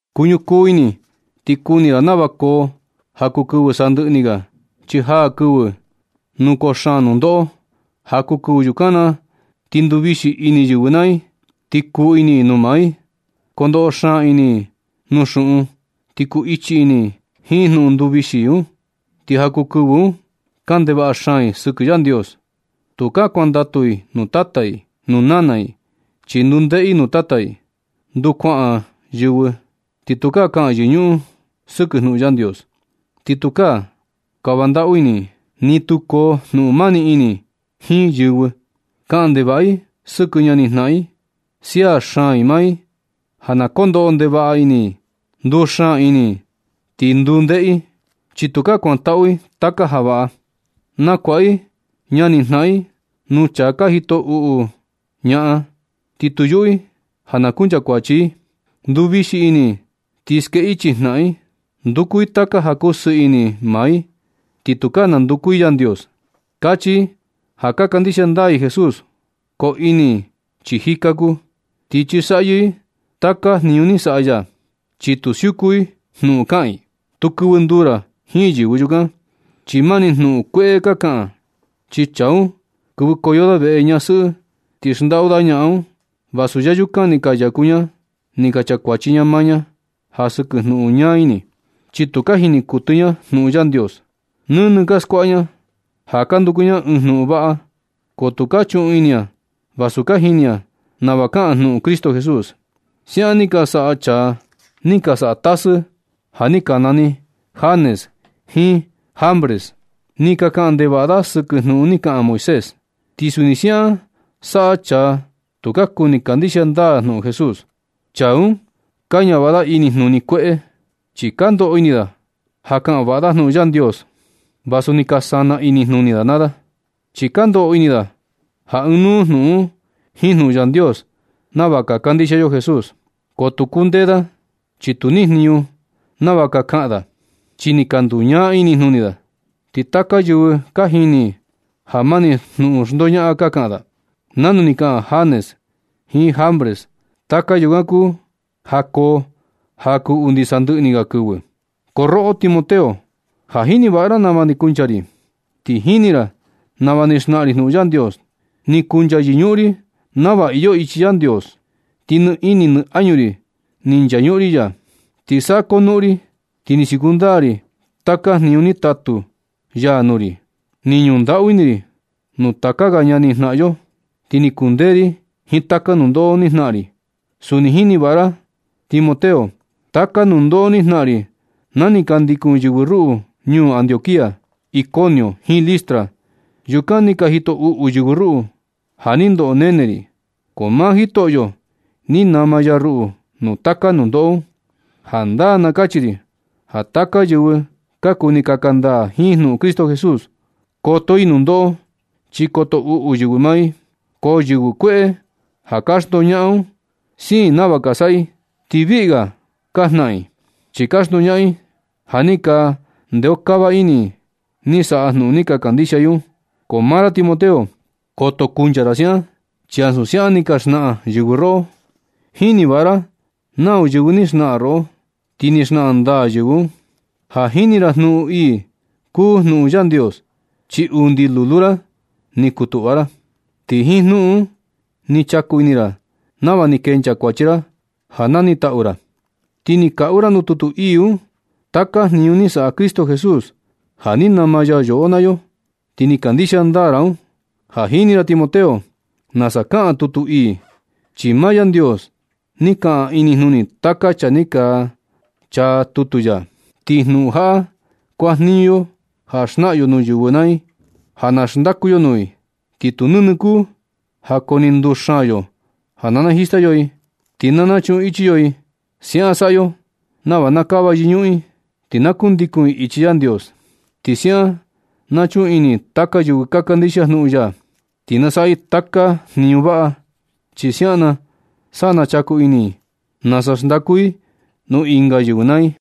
Kuñukuu ini ti kuni ra nava koo ja kuu kɨvɨ sandɨꞌɨ ni ga, chi jaa kɨvɨ nu koo xaan nundoꞌo. Ja kuu kɨvɨ yukan na ti nduvixi ini yɨvɨ naa i, ti kuu ini nuu maa i. Kondoꞌo xaan ini i nuu xuꞌun i, ti kuu ichi ini i jiin jnuꞌun nduvixi un. Ti ja kuu kɨvɨ un, kaꞌan ndevaꞌa xaan i sɨkɨ Yandios. Tukaa kuandatu i nuu tata i, nuu nana i, chi nduu ndeꞌe i nuu tata i. Nduu kuaꞌan yɨvɨ ti tukaa kaꞌan yɨñuꞌun i sɨkɨ jnuꞌun Yandios. Ni tukaa kava ndaꞌu ini i, ni tu koo jnuꞌun mani ini jiin yɨvɨ. Kaꞌan ndevaꞌa i sɨkɨ ñani jnaꞌan i. Sia xaan i maa i ja na kondoꞌo ndevaꞌa ini i, nduu xaan ini i, ti nduu ndeꞌe i, chi tukaa kuantaꞌu i taka ja vaꞌa. Nakuaꞌa i ñani jnaꞌan i nuu chaa ka jito uꞌu ñaꞌan, ti tu yuꞌu i ja na kunchakuachi i. Nduvixi ini i ti skee ichi ñaꞌan i. Nduku i taka ja kuu sɨɨ ini maa i ti tukaa nanduku i Yandios. Kachi i ja ka kandixia ndaa i Jesús, ko ini i chi jika kuu, ti chisaꞌyɨ i taka jniñu ni saꞌa ya, chi tu siuku i jnuꞌun kaꞌan i. Tu kɨvɨ nduu ra jiin yɨvɨ yukan, chi mani jnuꞌun kueꞌe ka kaꞌan i. Chi chaa un, kɨvɨkoyo da veꞌe ñasɨꞌɨ ti xndaꞌu da ñaꞌan un, vasu yayukan ni ka yaku ña ni ka chakuachi ña maa ña ja sɨkɨ jnuꞌun ñaa ini, chi tu ka jini kuɨtɨ ña jnuꞌun Yandios. Nɨnɨ ka skuaꞌa ña ja ka nanduku ña ɨɨn jnuꞌun vaꞌa, ko tu ka chuꞌun ini ña vasu ka jini ña nava kaꞌan jnuꞌun Cristo Jesús. Siaꞌan ni ka saꞌa chaa ni ka saꞌa tasɨ ja ni ka nani Janes jiin Jambres. Ni ka kaꞌan ndevaꞌa da sɨkɨ jnuꞌun ni kaꞌan Moisés. Ti suni siaꞌan saꞌa chaa tu ka kuni kandixia ndaa jnuꞌun Jesús. Chaa un ka ñavaꞌa da inijnuni kueꞌe, chi ka ndoꞌo ini da ja ka kaꞌan vaꞌa da jnuꞌun Yandios, vasu ni ka sana inijnuni da naa da. Chi ka ndoꞌo ini da ja ɨɨn nuu jnuꞌun un jiin jnuꞌun Yandios nava ka kandixia yo Jesús. Ko tu kundee da chi tu ni jniñu nava ka kaꞌan da, chi ni ka nduñaa inijnuni da. Ti taka yɨvɨ ka jini i ja mani jnuꞌun xndoñaꞌan ka kaꞌan da, nanu ni ka kaꞌan Janes jiin Jambres. Taka yukan kuu ja koo ja kuu undi sandɨꞌɨ ni ga kɨvɨ. Ko roꞌo Timoteo, ja jini vaꞌa ra nava ni kuncha ri, ti jini ra nava ni xnaꞌan ri jnuꞌun Yandios. Ni kuncha yɨñuꞌun ri nava iyo ichi Yandios, ti nɨ ini nɨ añu ri ni nchañuꞌun ri ya. Ni saꞌa konuꞌun ri ti ni siuku ndaa ri taka jniñu ni taꞌu ya nuu ri, ni ñuꞌun ndaꞌu ini ri nuu taka ga ñani jnaꞌan yo, ti ni kundee ri jiin taka nundoꞌo ni jnaꞌan ri. Suni jini vaꞌa ra Timoteo taka nundoꞌo ni jnaꞌan ri na ni ka ndikun yɨvɨ ruꞌu ñuu Antioquía, Iconio jiin Listra. Yukan ni ka jito uꞌu yɨvɨ ruꞌu ja ni ndoꞌo ni nene ri. Ko maa Jitoꞌo ni nama ya ruꞌu nuu taka nundoꞌo un. Jandaa na kachi ri ja taka yɨvɨ ka kuni kaka ndaa jiin jnuꞌun Cristo Jesús, koto i nundoꞌo chi koto uꞌu yɨvɨ maa i. Ko yɨvɨ kueꞌe ja ka xndoñaꞌan un, siin i nava ka saꞌa i ti viꞌi ga ka jnaꞌan i, chi ka xndoñaꞌan i ja ni ka ndeokava ini i ni saꞌa jnuꞌun ni ka kandixia i un. Ko maa ra Timoteo, koto kuncha ra siaꞌan, chi ansu siaꞌan ni ka xnaꞌan yɨvɨ roꞌo. Jini vaꞌa ra nau yɨvɨ ni xnaꞌan roꞌo, ti ni xnaꞌan ndaa yɨvɨ un. Ja jini ra ja jnuꞌun ii kuu jnuꞌun Yandios, chi undi lulu ra ni kutuꞌva ra. Ti jiin jnuꞌun un ni chaku ini ra nava ni kencha kuachi ra ja na nitaꞌu ra. Ti ni kaꞌu ra nuu tutu ii un taka jniñu ni saꞌa Cristo Jesús ja ni nama ya yoꞌo naa yo, ti ni kandixia ndaa ra un. Ja jini ra Timoteo, nasa kaꞌan tutu ii, chi maa Yandios ni kaꞌan inijnuni taka chaa ni ka chaa tutu ya. Ti jnuꞌun jaꞌa kuajniñu yo ja xnaꞌan yo nuu yɨvɨ naa i ja na xndaku yo nuu i. Ti tu nɨnɨ kuu ja kuani nduxaan yo ja na najista yo i, ti na nachuꞌun ichi yo i. Siaꞌan saꞌa yo nava na kava yɨñuꞌun i, ti na kundandikun i ichi Yandios. Ti Siaꞌan na chuꞌun ini taka yɨvɨ ka kandixia jnuꞌun ya, ti na saꞌa i taka jniñu vaꞌa. Chi siaꞌan na sa na chaku ini i nasa xndaku i nuu ɨnga yɨvɨ naa i.